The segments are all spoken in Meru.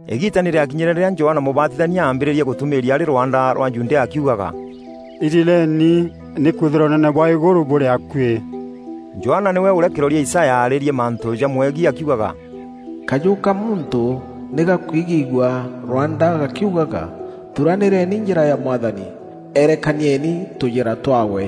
Îgiita nî rîakinyîre rîrîa Johana Mûbatithania aambîrîrie gûtûmîîria arî rwanda rwa Judea akiugaga: “Irireeni, nîkwîthîrwa ûnene bwa îgûrû bûrî akuî.” Johana nîwe ûrîa kîroria Isaya aarîrie mantû jamwegiî akiugaga: “Kajû ka muntû nî gakwigîîgua rwanda gakiugaga, ‘Thuranîreni njîra ya Mwathani, erekanieni tûjîra twaawe.’”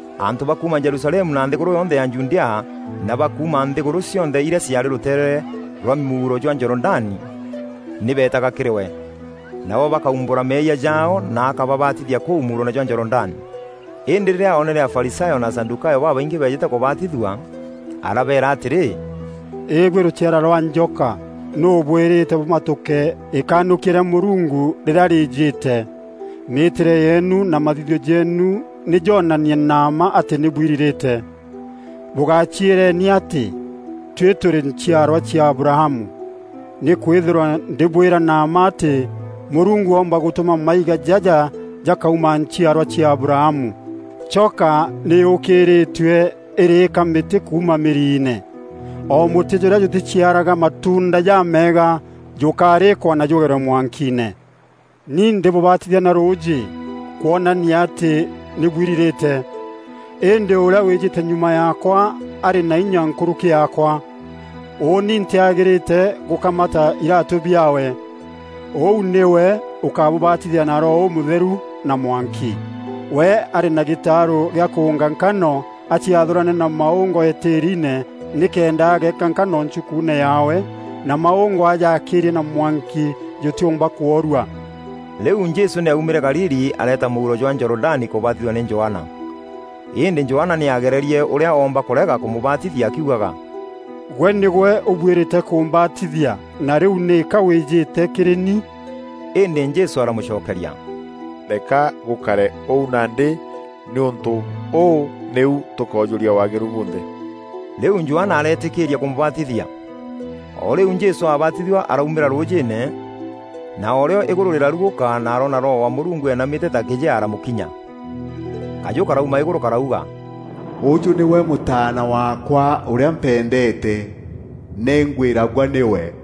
Antû ba kuuma Jerusalemu na nthîgûrû yonthe ya Judea na ba kuuma nthîgûrû cionthe irîa ciaarî rûteere rwa mûuro jwa Jorodani, nî beetaga kîrî we, nabo bakaumbûra meeyia jaao na akababatithia kûu mûuroone jwa Jorodani. Îndî rîrîa oonere Afarisayo na Asadûkayo babaingî beejîte kûbatithua, arabeera atîrî, “Îbuî rûciara rwa njoka! Nûû ûbwîrîte bûmatûke îkanûkia rîa Mûrungu rîrîa rîîjîte? Mîîtîre yeenu na mathithio jeenu nî joonanie na mma atî nî bwirirîte. Bûgaciîreni atî, ‘Tuî tûrî nchiarwa cia Abrahamu.’ Nîkwîthîrwa ndîbwîra na mma atî Mûrungu oomba gûtûma maiga jaja jakauma nchiarwa cia Abrahamu. Choka nî yûkîrîîtue îrîîka mîtî kuuma mîriine. O mûtî jûrîa jûtîciaraga matuunda jameega, jûkarîkwa na jûgerwe mwankiine. Ni ndîbûbatithia na rûûjî kwonania atî nî bwirirîte. Îndî ûrîa wîjîte nyuma yaakwa arî na inya nkûrûki yaakwa. Ûûni ntîagîrîte gûkamata iraatû biaawe. Ûu nîwe ûkabûbatithia na Roho Ûmûtheru na mwanki. We arî na gîtaarû gîa kûûnga nkano aciathûrane na maûngo îtîriine nîkenda ageeka nkano nchukuune yaawe na maûngo ajaakîîrie na mwanki jûtîûmba kwoorua.” Rîu Jesû nî aumîre Galili areeta mûuro jwa Jorodani kûbatithua nî Johana. Îndî Johana nî aagererie ûrîa oomba kûrega kûmûbatithia akiugaga, “Gwe nîgwe ûbuîrîte kûmbatithia na rîu nîka wîjîte kîrî ni?” Îndî Jesû aramûcokeria, “Reka gûkare ûu nandî, nîûntû ûû nîu tûkoojûria waagîru bunthe.” Rîu Johana areetîkîîria kûmûbatithia. O rîu Jesû abaatithua araumîra rûûjîîne na o rîo îgûrû rîrarugûka na aroona Roho wa Mûrungu eenamîte ta kîjea aramûkinya. Kajû karauma îgûrû karauga, “Ûjû nîwe Mûtaana waakwa ûrîa mpendeete, nî ngwîragua nîwe.”